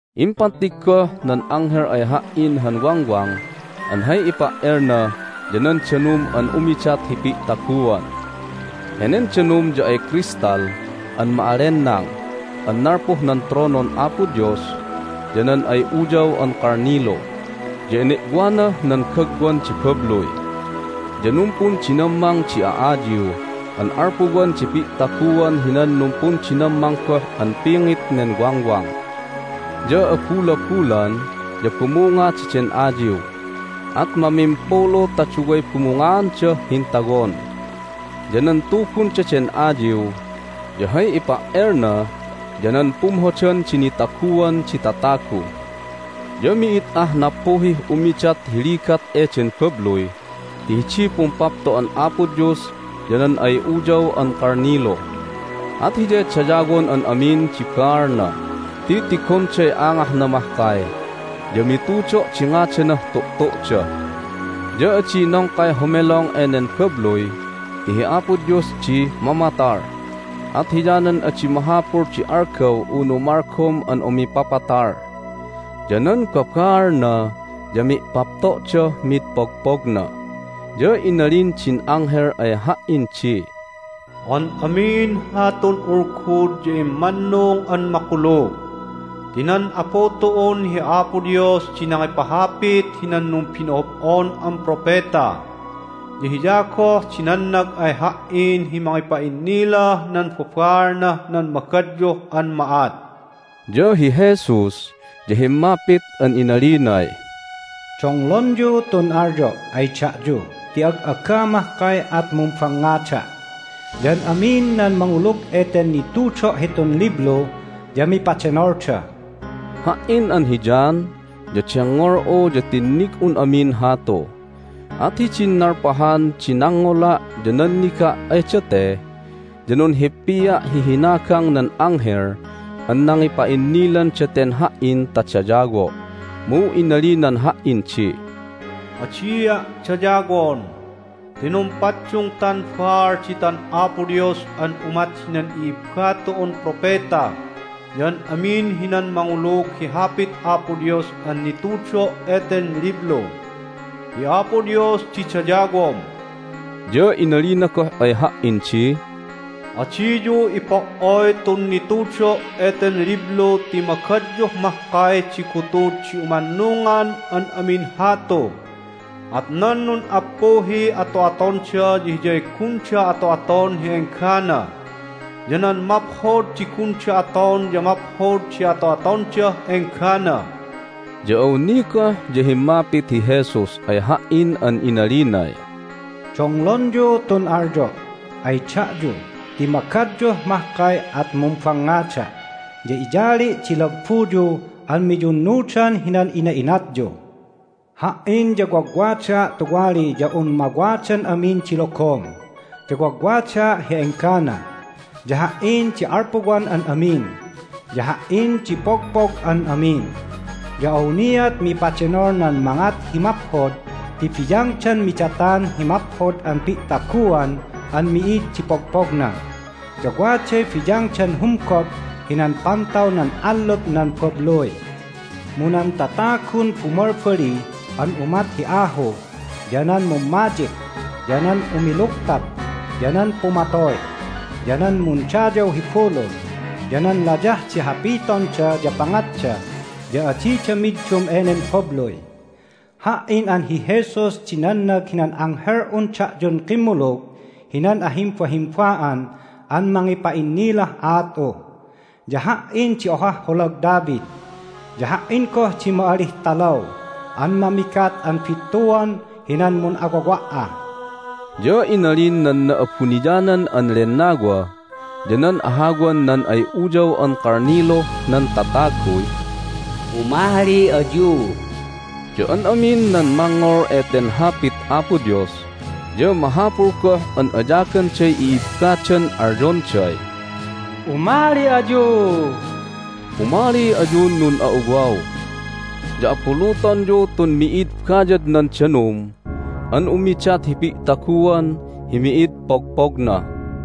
Impattig goh nan anghel ay ha"in han wangwang an hay ipa"elna ya nan danum an umidat hi pi'taguan. Henen danum ya ay crystal an ma'allenang an nalpuh nan tronon Apo Dios ya nan ay Uyaw an Kalnilu, ya ene'wanah nan gagwan di babluy. Ya numpundinammang di a'ayiw an alpuwan di pi'taguan hinan numpundinammang goh an pingit nen wangwang. Ya abulabulan ya bumunga daden ayiw, at mamimpulu ta duway bumungaandah hintawon. Ya nan tubun daden ayiw ya hay ipa"elna ya nan pumhodan di nitaguan di tatagu. Ya mi'id ah nappuhih umidat hi ligat eden babluy ti hidiy pumpapto'an Apo Dios ya nan ay Uyaw an Kalnilu. At Hiyay dayawon an amin di baalna ti tigonday angahna mahkay, ya mitudo' di ngadanah tu'tu'da. Ya adi nongkay homelong enen babluy ti hi Apo Dios di mamatal, at hiyanan adi mahapul di algaw unu malgom an umipapatal. Ya nan babaalna ya mi'papto'dah mid pogpogna. Ya inalin din anghel ay ha"in di, "An amin hatun ulgud ya immannung an makulug. Ti nan Apu tu'un hi Apo Dios di nangipahapit hinan numbino'ob'on an propeta, ya Hiya goh di nannag ay ha"in hi mangipa'innilah nan babaalnah nan magadyuh an ma'at." Ya hi Jesus ya himmapit an inalinay, "Donglonyu tun alyo' ay da'yu ti ag'aga mahkay at mumbangngada'! Ya an amin nan mangulug eten nitudo' hitun liblu ya mipadenolda!" Ha"in an hi John ya dengngol'u ya tinnig'un amin hatu. At hidin nalpahan di nangngola' ya nanniga' ay date ya nunhippia' hi hinagang nan anghel an nangipa'innilan daten ha"in ta dayawo'. Mu inalinan ha"in di, "Adia' dayawon! Ti numpaddungtan baal ditan Apo Dios an umat hinan i'ibba tu'un propeta ya an amin hinan mangulug hi Hapit Apo Dios an nitudo' eten liblu. Hi Apo Dios di dayawom!" Ya inalina goh ay ha"in di, "Adiyu ipo"oy tun nitudo' eten liblu ti magadyuh mahkay di gutud hi umannungan an amin hatu. At nan nun'appuhiy ato'atonda ya hiyay gunda ato'aton hi enggana, ya nan maphod di gunda aton ya maphod di ato'atondah enggana." Ya awni goh ya himmapit hi Jesus ay ha"in an inalinay, "Donglonyu tun alyo' ay da'yu ti magadyuh mahkay at mumbangngada'! Ya iyali' di lagbuyu an miyunnudan hinan ina'inatyu. Ha"in ya wagwadaa' tuwali ya un mawadan amin di logom, ya wagwadaa' hi enggana. Ya Ha"in di alpuwan an amin, ya Ha"in di pogpog an amin. Ya awniat mipadenol nan mangat hi maphod ti biyangdan midatan hi maphod an pi'taguan an mi'id di pogpogna, ya waday biyangdan humgop hinan pantaw nan allup nan babluy. Mu nan tatagun bumalbali an umat hi ahu, ya nan mummadyik, ya nan umilugtap, ya nan pumatoy, ya nan mundayaw hi bulul, ya nan layah di hapitonda ya pangatda ya adida middum enen babluy. Ha"in an hi Jesus di nannag hinan anghel'un da'yun kimmulug hinan ahimbahimba'an an mangipa'innilah aat'u. Ya Ha"in di ohah holag David, ya Ha"in goh di ma'alih talaw an mamigat an bittuan hinan mun'awawa'ah." Ya inalin nan Na'abuniyanan an Lennawa ya nan ahawan nan ay Uyaw an Kalniluh nan tataguy, "Umali ayu!" Ya an amin nan mangngol eten Hapit Apo Dios ya mahapul goh an ayaganday i'ibbadan alyonday, "Umali ayu! Umali ayun nun'a'uwaw! Ya abulutonyu tun mi'id bayadnan danum an umidat hi pi'taguan hi mi'id pogpogna!"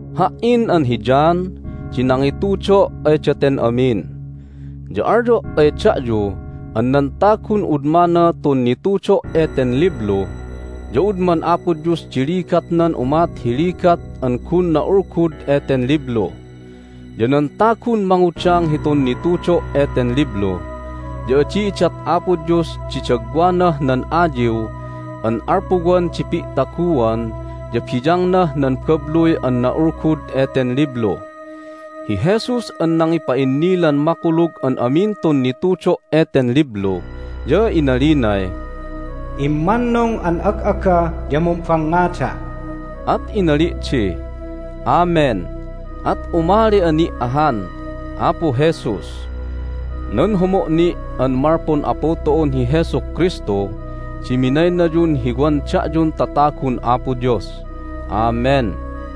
Ha"in an hi John di nangitudo' ay daten amin. Ya alyo' ay da'yu an nan tagun udmana tun nitudo' eten liblu ya udman Apo Dios di ligatnan umat hi ligat an gun na'ulgud eten liblu. Ya nan tagun mangudang hitun nitudo' eten liblu ya adi idat Apo Dios di dagwanah nan ayiw an alpuwan di pi'taguan ya biyangnah nan babluy an na'ulgud eten liblu. Hi Jesus an nangipa'innilan makulug an amin tun nitudo' eten liblu ya inalinay, "Immannung an ag'aga ya mumbangngada'!" At inali' di, "Amen! At umali'a ni' ahan, Apu Jesus!" Nan homo' ni' an malpun Apu tu'un hi Jesu Kristu di minaynayun hi wan da'yun tatagun Apo Dios. Amen.